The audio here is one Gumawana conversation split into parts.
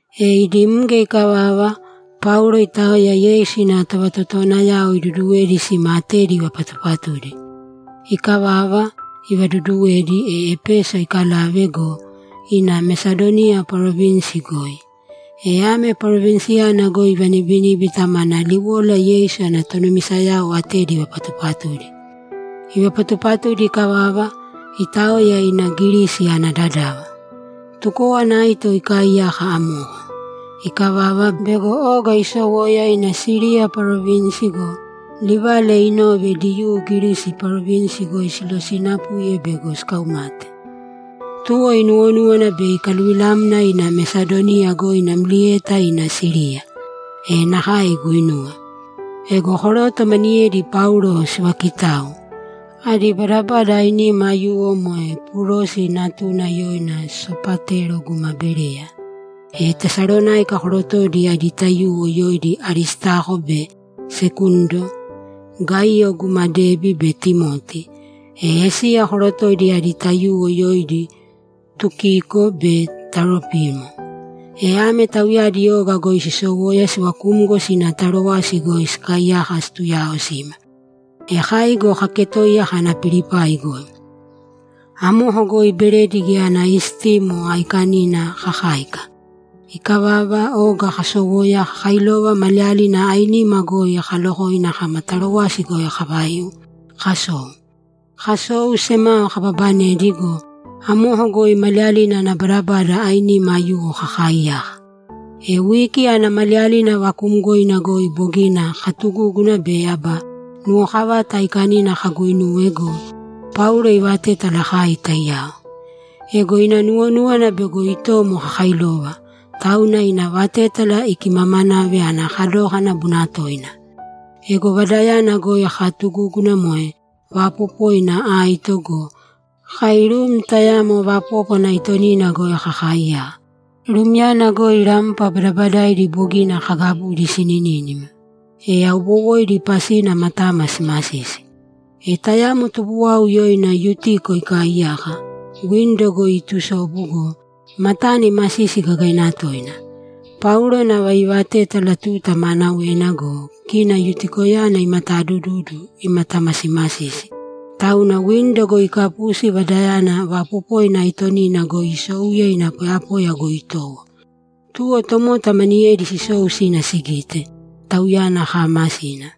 E idi mge ikavava, Paulo itaoya Yeisu ina tovatotowanayao iduduwedi sima atedi ivapatupatudi. Ikavava, ivaduduwedi, e Epeso ikalave go, ina Mesadoniya parovinsi goi. E ame parovinsiyana goi ivanibiníbita mana liwola Yeisu ana tonumisayao atedi ivapatupatudi. Ivapatupatudi ikavava, itaoya ina Girisi ana dadava. Tukówana aito ikaaiyaka amoko. Ikavava, bego oga isowoya ina Siriya parovinsi go, livala inove Diyuu Girisi parovinsi goi silosinapuye bego sikaumate. Tuwo inuwonúwana bei ikaluvilamna ina Mesadoniya goi namlieta ina Siriya. E nakae iguinuwe. Ego koroto maniyedi Paulo sivaakitau. Adi badabada ainima aiyuwo moe Purosi natuna yoina Sopatero guma Bereya, e Tesalonáika korotoidi adi taiyuwo yoidi Aristako be Sekundo, Gaiyo guma Debi be Timoti, e Esiya korotoidi adi taiyuwo yoidi Tukiko be Taropimo. E ame tauyadi oga goi sisowoya sivakumgo sina Tarowasi goi sikaaiyaka situyaaosima. E kai go kaketoiya kana Pilipai goi. Amoko goi Beredi Geya Ana Istimo Aikanina kakáika. Ikavava, oga kasowoya kakailova maliyalina ainima goi kalokoina kama Tarowasi goi kavaiu, kasou. Kasou, semao kababanedi go, amoko goi maliyalina ana badabada ainima aiyuwo kakaaiyaka. E wiki ana maliyalina vakuumgoina goi bogina katugúguna be aba nuwokavata aikanina kaguinuwe go, Paulo ivaatétala kai taiyao. Ego ina nuwonúwana bego itomo kakailova, tauna ina vatétala ikimamanave ana kadókana bunatoina. Ego vadayana goi kaatugúguna moe vaapopoina aito go, kai rum tayamo vapópwana aitonina goi kakaaiyaka. Rumyana goi rampa badabadaidi bogina kagabudi sininínima, e aubowoidi pasina matama simasisi. E tayamo tubuwau yoina Yutiko ikaaiyaka, windo goi iitusobu go, matana imasisi gagaina toina. Paulo nava iivatétala tuta maanawena go, kina Yutikoyana imatadududu, imatamasimasisi, tauna windo goi ikapusi vadayana vaapopoina aitonina goi isouye ina poyapoya goi itowo. Tuwo tomota maniyedi sisou sina sigite, tauyana kaamasina.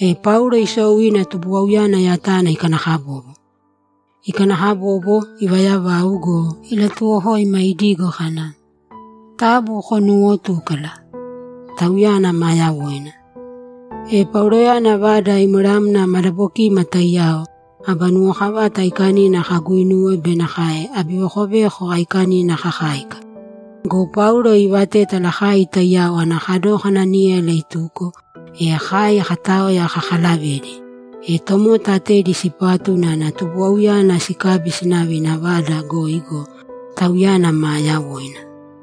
E Paulo isou ina tubuwauyana yatana ikanakabobo. Ikanakabobo, ivayavau go, ilatuwokoima idigo kana, ‘Taabu konuuwotūkala! Tauyana maa yawoina.’ E Pauloyana vada imweramna madabokima taiyao, aba nuwokavata aikanina kaguinuwe be nakae abivekoveko aikanina kakáika. Go Paulo iivatétala kai taiyao ana kadókana níyala ituko, e kai kataoya kakalavedi. E tomota atedi sipatu unana tubuwauyana sikabi sinave ina vada goi go, tauyana maa yawoina.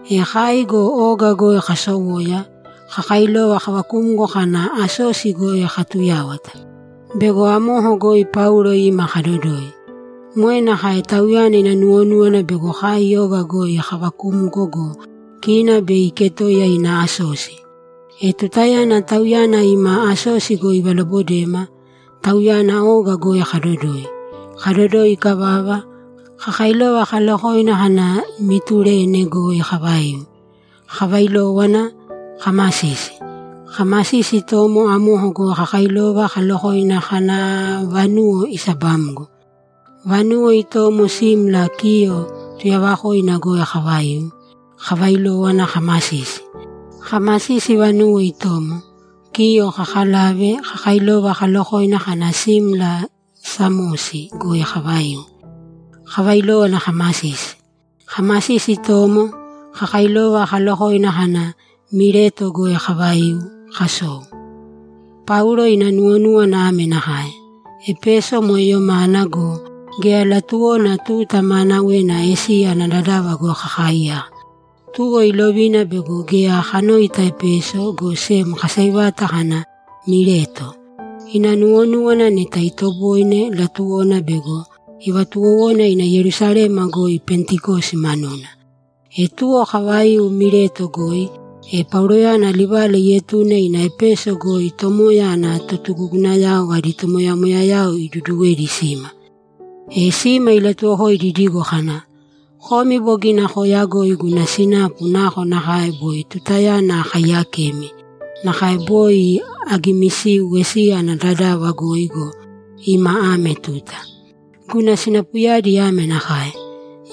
E kai go oga goi kasowoya, kakailova kavakumgo kana Asosi goi katuyáwata; bego amoko goi Paulo ima kadodoi. Moe nakae tauyana ina nuwonúwana bego kai oga goi kavakumgo go, kina bei iketoiya ina Asosi. E tutayana tauyana ima Asosi goi ivalobodema, tauyana oga goi kadodoi. Kadodoi ikavava, kakailova kalokoina kana Mitulene goi kavaiu, kavailówana kamasisi. Kamasisi itomo, amoko goi kakailova kalolokoina kana aaa, vanuwo isabamgo. Vanuwo itomo simla Kiyo tuyavakoina goi kavaiu, kavailówana kamasisi. Kamasisi vanuwo itomo, Kiyo kakalave, kakailova kalokoina kana simla Samosi goi kavaiu, kavailówana kamasisi. Kamasisi itomo, kakailova kalokoina kana Mileto goi kavaiu, kasou. Paulo ina nuwonúwana ame nakae: Epeso moe yomana go, geya latuwona tuta maanawena Esiya ana dadava goi kakaiyaka. Tuwo ilovina bego geya kanoita Epeso, go sem kaseivata kana Mileto. Ina nuwonúwana neta itoboine, latuwona bego ivatuwowona ina Yerusalema goi Pentikosi manuna. E tuwo kavaiu Mileto goi, e Pauloyana livala ietune ina Epeso goi Tomoya ana totugugunayao adi tomoyamoyayao iduduwedi sima. E sima ilatuwokoidi idigo kana, ‘Komi bogina kooyagoi guna sinapu nakonakae boi tutayana akaiyakemi, nakae boi agimisiu Esiya ana dadava goi go, ima ame tuta. Guna sinapuyadi ame nakae: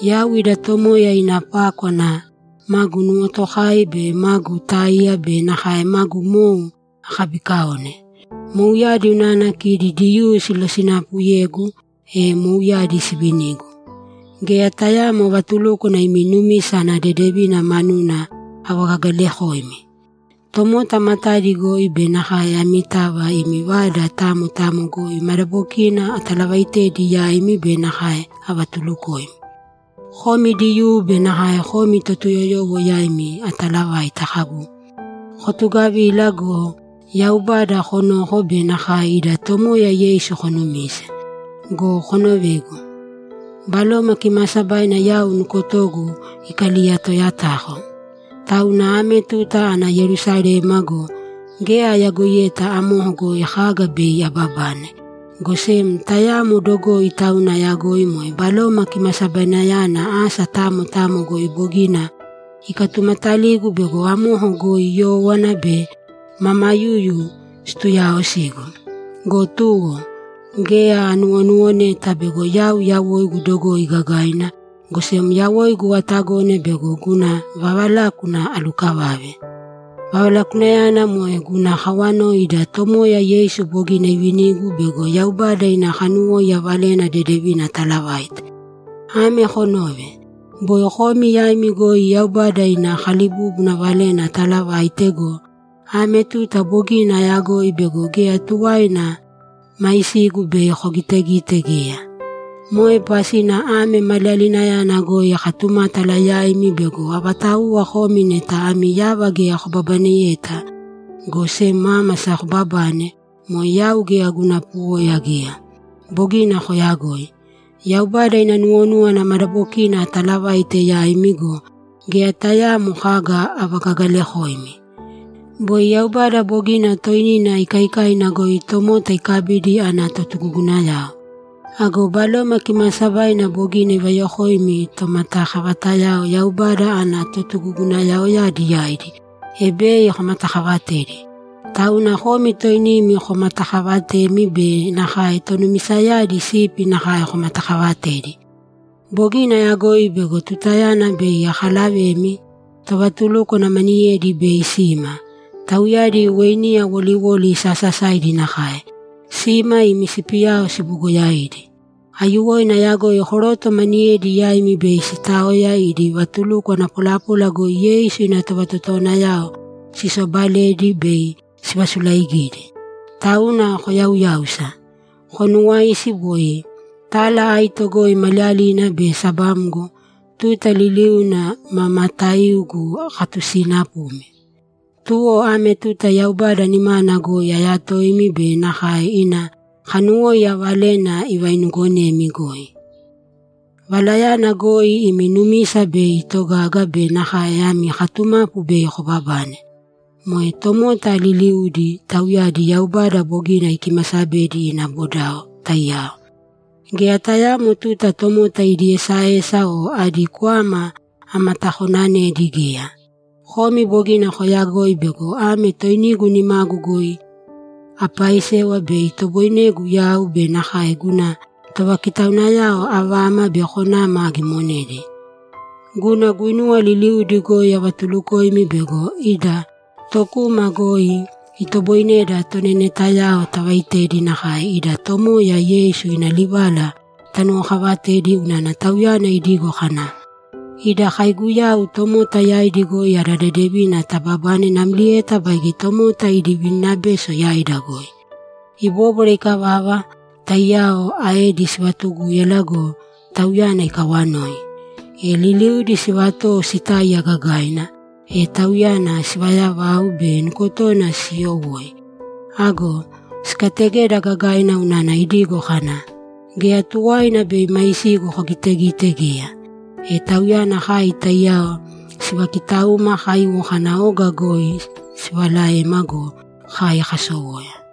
Yau ida Tomoya ina pákwana magu nuwotokai be magu táiya be nakae magu mou akabiikaone. Mouyadi unana kidi Diyuu silosinapuyegu, e mouyadi sivinigu. Geya tayaamo vatulúkwana imi numisa ana dedevina manuna avagagalakoimi. Tomota matadi goi be nakae amitava imi vada tamo tamo goi madabokina atalavaitedi yaimi be nakae avatulukoimi. Komi Diyuu be nakae komi Totuyoyowo yaimi atalavaita kagu, “Kotugavīla go, Yaubada konōko be nakae ida Tomoya Yeisu konumīse.” Go konovēgu. Baloma Kimaasabaina yau nukotogu ikaliyatayatako. Tauna ame tuta ana Yerusalema go, geya ayagoiyeta amoko goi kaga bei ababane, go sem tayamo dogoi tauna ayagoi moe Baloma Kimasabainayana asa tamo tamo goi bogina ikatumataligu bego amoko goi yówana be mamayuyu situuyaosigu. Go tuwo, geya anuwonuwoneta bego yau yawoigu dogoi gagaina, go sem yawoigu atagone bego guna vavalákuna alukavave; vavalakunayana moe guna kawoi ida Tomoya Yeisu bogina ivinigu bego Yaubada ina kanuwóiya Valena Dedevina atalavaite. Ame konōve! Boi komi yaimi goi Yaubada ina kalibúbuna valena atalavaite go, ame tuta bogina ayagoi bego geya tuwaina maisigu bei kogitegite geya. Moe pasina ame maliyalinayana goi akatumátala yaimi bego avatauwa komi neta ami yava geya kobabaneyeta, go sem ámasa kobabane, moe yau geya guna puwoya geya. Bogina koyagoi. Yaubada ina nuwonúwana madabokina atalavaite yaimi go, geya tayaamo kaga avagagalakoimi. Boi Yaubada bogina toinina ikaikaina goi tomota ikabidi ana totugugunayao. Ago Baloma Kimaasabaina bogina ivayokoimi tomatakavatayao Yaubada ana totugugunayaoyadi yaidi, e bei komatakavatedi. Tauna komi toinimi komatakavatēmi be nakae tonumisayadi sipi nakae komatakavatēdi. Bogina ayagoi bego tutayana bei akalavemi, tovatulúkwana maniyedi bei sima; tauyadi weiniya woliwoli sasasaidi nakae. Sima imi sipiyao sibugoyaidi. Aiyuwoina ayagoi koroto maniyedi yaimi bei sitaoya idi vatulukwana polapola goi Yeisu ina tovatotowanayao sisobaledi bei sivasulaigidi. Tauna koyauyāusa. Konuwāisi boi tala aito goi maliyalina be sabamgo, tuta liliuna ma mataiugu akatusiinapumi. Tuwo ame tuta Yaubada nimana goi ayatoimi be nakae ina kanuwóiya valena ivainuugonemi goi. Valayana goi imi numisa bei itogaga be nakae ami katumapu bei kobabane. Moe tomota liliudi, tauyadi Yaubada bogina ikimasabedi ina bodao, taiyao. Geya tayaamo tuta tomota idi esaesa o adi kwama amatakonanedi geya. Komi bogina koyagoi bego ame toinigu nimagu goi apaisewa bei itoboinegu yau be nakae guna tovakitaunayao avama be konama agimonedi. Guna guinuwa liliudi goi avatulukoimi bego ida tokuma goi itoboineda tonenetayao tavaitedi nakae ida Tomoya Yeisu ina livala tanuwokavatedi unana Tauyana idigo kana, “Ida kaiguyau tomota yaidi goi ada dedevina tababane namlieta baige tomota idi vininabeso yaida goi.”’ Ibóbwara ikavava, taiyao aedi sivatugúyala go, tauyana ikawanoi. E liliudi sivatowo sitáiya gagaina, e tauyana sivayavau be nukotona siiyowoi. Ago sikategeda gagaina unana idigo kana, ‘Geya tuwaina bei maisigu kogitegite geya.’ E tauyana kai taiyao sivakitauma kaiwo kana oga goi sivalavema go, kai kasowoya.